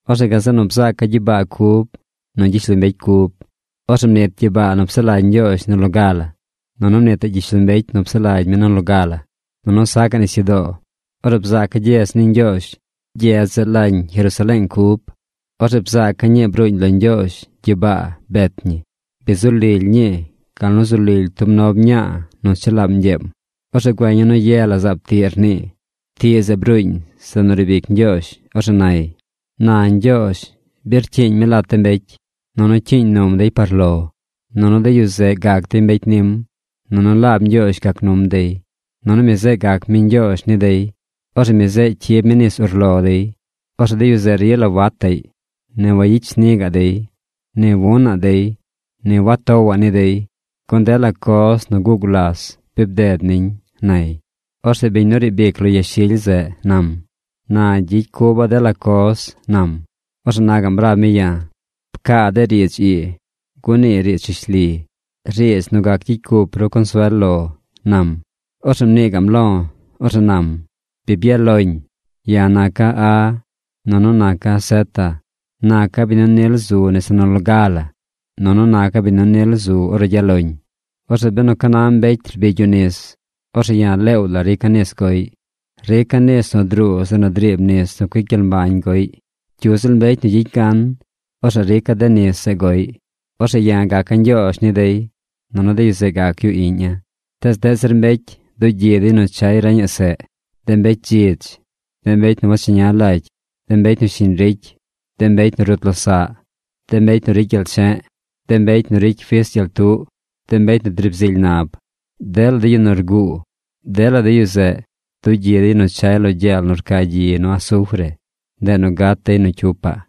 Orzeꞌ gazeꞌ nu bzaaca̱ gyibaa cub nu gyishlombecy cub. Orzeꞌ mnit gyibaa nu psaꞌ lagy Ñgyoozh nu loga la, nunu mnitaꞌ gyishlombecy nu psaꞌ lagy mi nu loga la. Nunu sacaꞌ nisyudoo. Orzeꞌ bzaaca̱ gyedz ni Ñgyoozh. Gyedz zeꞌ lañ Jerusaleeng cub. Orzeꞌ bzaaca̱ ñii bruuñ lo Ñgyoozh gyibaa bet ñi. Bi zu lily ñii gal nu zu lily tub nob mñaa nu chelaam ñgyeem. Orzeꞌ güeña̱ nu ye la zaab tiꞌ rnii. Tiꞌ zeꞌ bruuñ zeꞌ nu riib ic Ñgyoozh. Orzeꞌ nay: ―Na Ñgyoozh bi rcyiiñ mi lat de mbecy. Nunu cyiiñ num dey par lo. Nunu de yu zeꞌ gac dey mbecy nim. Nunu laab Ñgyoozh gac num dey. Nunu mi zeꞌ gac mi Ñgyoozh ni dey. Orzeꞌ mi zeꞌ cyib mi nis urlo dey. Orzeꞌ de yu zeꞌ rila wataꞌy, ni wayicy shni gaꞌ dey, ni wunaꞌ dey, ni wagatowaꞌ ni dey. Gun dela coz nu guꞌ gulas bi bded niñ ―nay. Orzeꞌ biñ nu riib ic lo yashily zeꞌ nam: ―Na gyicy cuba̱ dela coz ―nam. Orzeꞌ na gaꞌm rab mi ya̱: ―Pcaa de riidz ii, gun nii riidz rishli, riidz nu gac gyicy cup ru consuel lo ―nam. Orzeꞌ mnii gaꞌm lo̱. Orzeꞌ nam: ―Bi byaꞌ loñ. Ya̱ naca̱ A, nunu naca̱ zeta. Naca̱ biñ nu nil zu nese nu loga la. Nunu naca̱ biñ nu nil zu ornu gyaꞌ loñ. Orzeꞌ benu ca na mbecy rbigy yu nis, orzeꞌ ya̱ leew la rica̱ nis goꞌy. Rica̱ nis nu druu zeꞌ nu driib nis nu cuic gyel mbañ goꞌy. Cyu ziꞌl mbecy nu gyicy gan, orzeꞌ rica̱ de nis zeꞌ goꞌy. Orzeꞌ ya̱ gaca̱ Ñgyoozh ni dey, nunu de yu zeꞌ gac yu iꞌña̱. Tees deꞌ zir mbecy dugyi dey nu chay reñaꞌ seꞌ. De mbecy dzidz, de mbecy nu wacheña lagy, de mbecy nu shiñ ricy, de mbecy nu rut losaꞌ, de mbecy nu ricy gyel che̱ꞌ, de mbecy nu ricy fis gyel tuꞌ, de mbecy nu driib zily nab, dela de yu nu rguu, dela de yu zeꞌ dugyi dey nu chay lo gyel nu rca gyi nu asufre. Ndeꞌ nu gat dey nu cyupaꞌ.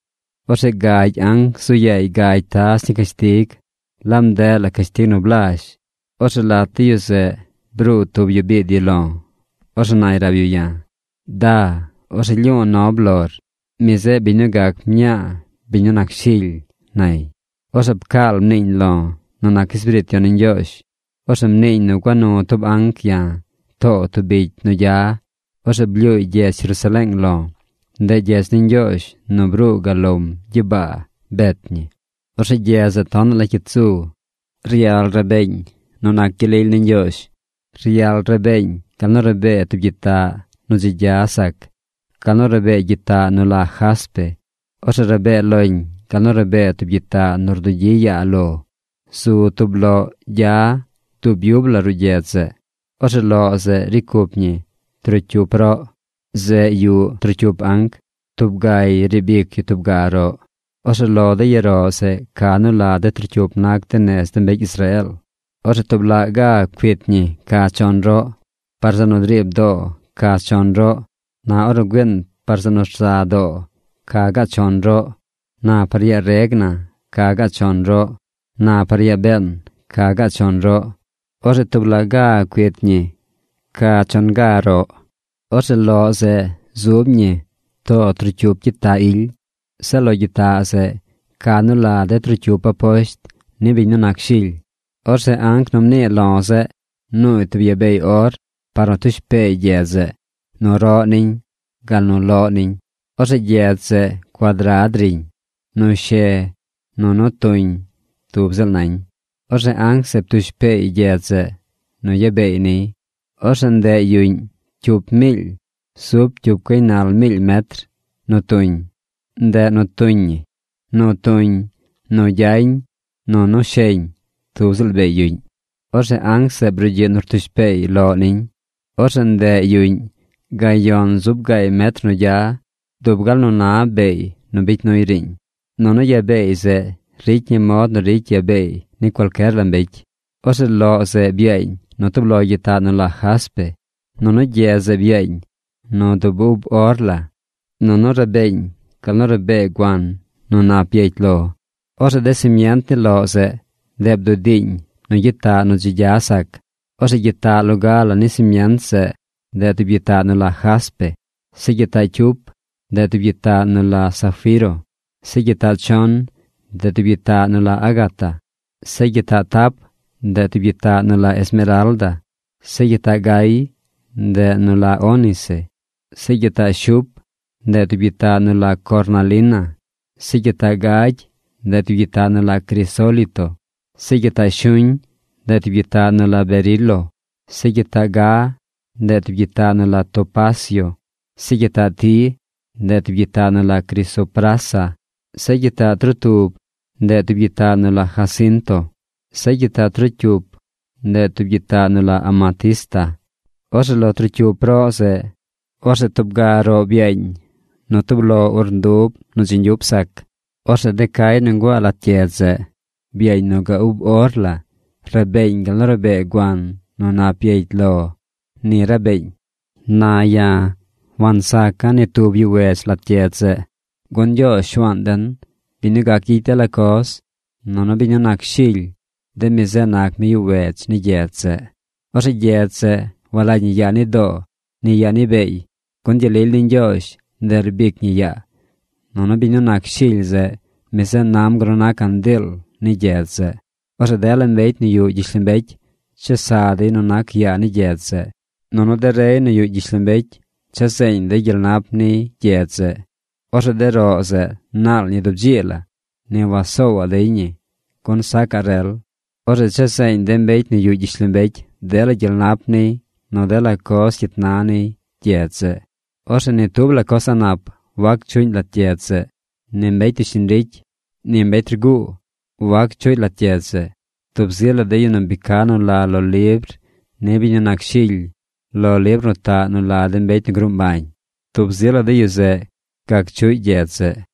Orzeꞌ gagy anc zu yaay gagy taz ni cashtig. Laab ndeꞌ la cashtig nu blazh. Orzeꞌ lat de yu zeꞌ bruu tub yu biid yu lo̱. Orzeꞌ nay rab yu ya̱: ―Da. Orzeꞌ lyu̱u̱ nob lor. Mi zeꞌ biñ nu gac mñaa biñ nu nac Shily ―nay. Orzeꞌ pcaal mniiñ lo̱ nu nac Espiriit Yon ni Ñgyoozh. Orzeꞌ mniiñ nu gua nu tub anc ya̱ too tub bicy nu gya. Orzeꞌ blyuuy gyedz Jerusaleeng lo̱. Ndeꞌ gyedz ni Ñgyoozh nu bruu gal lom gyibaa bet ñi. Orzeꞌ gyedz zeꞌ tonaꞌ la cyit zu. Ryal rabeeñ nu nac gyel lily ni Ñgyoozh. Ryal rabeeñ gal nu rabee tub gyitaꞌ nu dzi gya sac, gal nu rabee gyitaꞌ nu la jaspe. Orzeꞌ rabee loñ gal nu rabee tub gyitaꞌ nu rdugyi yaa lo. Zu tub loꞌ gya dub yub la ruꞌ gyedz zeꞌ. Orzeꞌ loꞌ zeꞌ ricy cup ñi trocyup roꞌ. Zeꞌ yuꞌ trocyup anc. Tub gay riib ic yu tub ga roꞌ. Orzeꞌ lo de ya roꞌ zeꞌ ca nu la de trocyup nac nez de mbecy Israeel. Orzeꞌ tub laꞌ ga cuit ñi ca chon roꞌ. Par zeꞌ nu driib doo ca chon roꞌ. Na ornu güiin par zeꞌ nu rza doo, ca gaꞌ chon roꞌ. Na par yaa reg na ca gaꞌ chon roꞌ. Na par yaa been, ca gaꞌ chon roꞌ. Orzeꞌ tub laꞌ ga cuit ñi ca chon roꞌ. Orzeꞌ loꞌ zeꞌ zub ñi too trocyup gyitaꞌ ily. Zeꞌ lo de gyitaꞌ zeꞌ ca nu la de trocyup aposht ni biñ nu nac Shily. Orzeꞌ anc nu mnii lo̱ nuuy tub ya beey or par nu tush peey gyedz zeꞌ, nu roꞌ niñ, gal nu loꞌ niñ. Orzeꞌ gyedz zeꞌ cuadrad riñ. Nu she nu nu tuñ tub ziꞌl nañ. Orzeꞌ anc zeꞌ ptush peey gyedz zeꞌ nu ya beey niy. Orzeꞌ ndeꞌ yuꞌñ cyup miily zub cyup gaynal kilometros nu tuñ. Ndeꞌ nu tuñ ñi. Nu tuñ, nu gyañ, nu nu sheñ tub ziꞌl beey yuꞌñ. Orzeꞌ anc zeꞌ brugyiꞌ nu rtush peey loꞌ niñ. Orzeꞌ ndeꞌ gayon zub gaay metr nu gya, dub gal nu na ya beey nu bicy nuy riiñ. Nunu ya beey zeꞌ ricy ñi mod nu ricy ya beey ni cualcyer la mbecy. Orzeꞌ loꞌ zeꞌ byaañ nu tub lo gyitaꞌ nu la jaspe. Nunu gyedz zeꞌ byaañ nu du ub or la. Nunu rabeeñ gal nu rabee guan nu nap byecy lo. Orzeꞌ de simient ni loꞌ zeꞌ, ndeꞌ bdudiiñ nu gyitaꞌ nu dzi gya sac. Orzeꞌ gyitaꞌ loga la ni simient zeꞌ, ndeꞌ tub gyitaꞌ nu la jaspe. Zeꞌ gyitaꞌ cyup, ndeꞌ tub gyitaꞌ nu la zafiro. Zeꞌ gyitaꞌ chon, ndeꞌ tub gyitaꞌ nu la ágata. Zeꞌ gyitaꞌ tap, ndeꞌ tub gyitaꞌ nu la esmeralda. Zeꞌ gyitaꞌ gay, ndeꞌ nu la ónice. Zeꞌ gyitaꞌ shup, ndeꞌ tub gyitaꞌ nu la cornalina. Zeꞌ gyitaꞌ gagy, ndeꞌ tub gyitaꞌ nu la crisólito. Zeꞌ gyitaꞌ shuñ, ndeꞌ tub gyitaꞌ nu la berilo. Zeꞌ gyitaꞌ ga, ndeꞌ tub gyitaꞌ nu la topacio. Zeꞌ gyitaꞌ ti, ndeꞌ tub gyitaꞌ nu la crisoprasa. Zeꞌ gyitaꞌ trotub, ndeꞌ tub gyitaꞌ nu la jacinto. Zeꞌ gyitaꞌ trocyup, ndeꞌ tub gyitaꞌ nu la amatista. Orzeꞌ lo trocyup roꞌ zeꞌ, orzeꞌ tub ga roꞌ byaañ nu tub urndub nu dzi ñgyup sac. Orzeꞌ de cay nu nguaa lat gyedz zeꞌ, byaañ nu ga ub or la. Rabeeñ gal nu rabee guan nu nap byecy lo. Ni rabeeñ. Na ya̱ wansaca̱ ni tub yuꞌ wedz lat gyedz zeꞌ. Gun Ñgyoozh Shuaan den, biñ nu gac gyicy dela coz, nunu biñ nu nac Shily, de mi zeꞌ nac mi yuꞌ wedz ni gyedz zeꞌ. Orzeꞌ gyedz zeꞌ walagy ñi yaa ni doo ni yaa ni beey, gun gyel lily ni Ñgyoozh, ndeꞌ rbic ñi yaa. Nunu biñ nu nac Shily zeꞌ, mi zeꞌ nam gal nu na candiil ni gyedz zeꞌ. Orzeꞌ dela mbecy nu yuꞌ gyishlombecy chesa dey nu nac yaa ni gyedz zeꞌ. Nunu de rey nu yuꞌ gyishlombecy cha zeeñ dey gyel nap niy gyedz zeꞌ. Orzeꞌ de roꞌ zeꞌ naal ñi dub dzii la. Ni wasoowaꞌ dey ñi gun sacaꞌ rel. Orzeꞌ cha zeeñ de mbecy nu yuꞌ gyishlombecy dela gyel nap niy nu dela coz cyit na niy gyedz zeꞌ. Orzeꞌ ni tub coz a̱ꞌ nap wac chuꞌñ lat gyedz zeꞌ. Ni mbecy nu shiñ ricy, ni mbecy nu rguu wac chuꞌy lat gyedz zeꞌ. Tub zi la de yu nu bi ca nu la lo libr ni biñ nu nac Shily, lo libr nu taꞌ nu la de mbecy nu gruu mbañ, tub zi la de yu zeꞌ gac chuꞌy gyedz zeꞌ.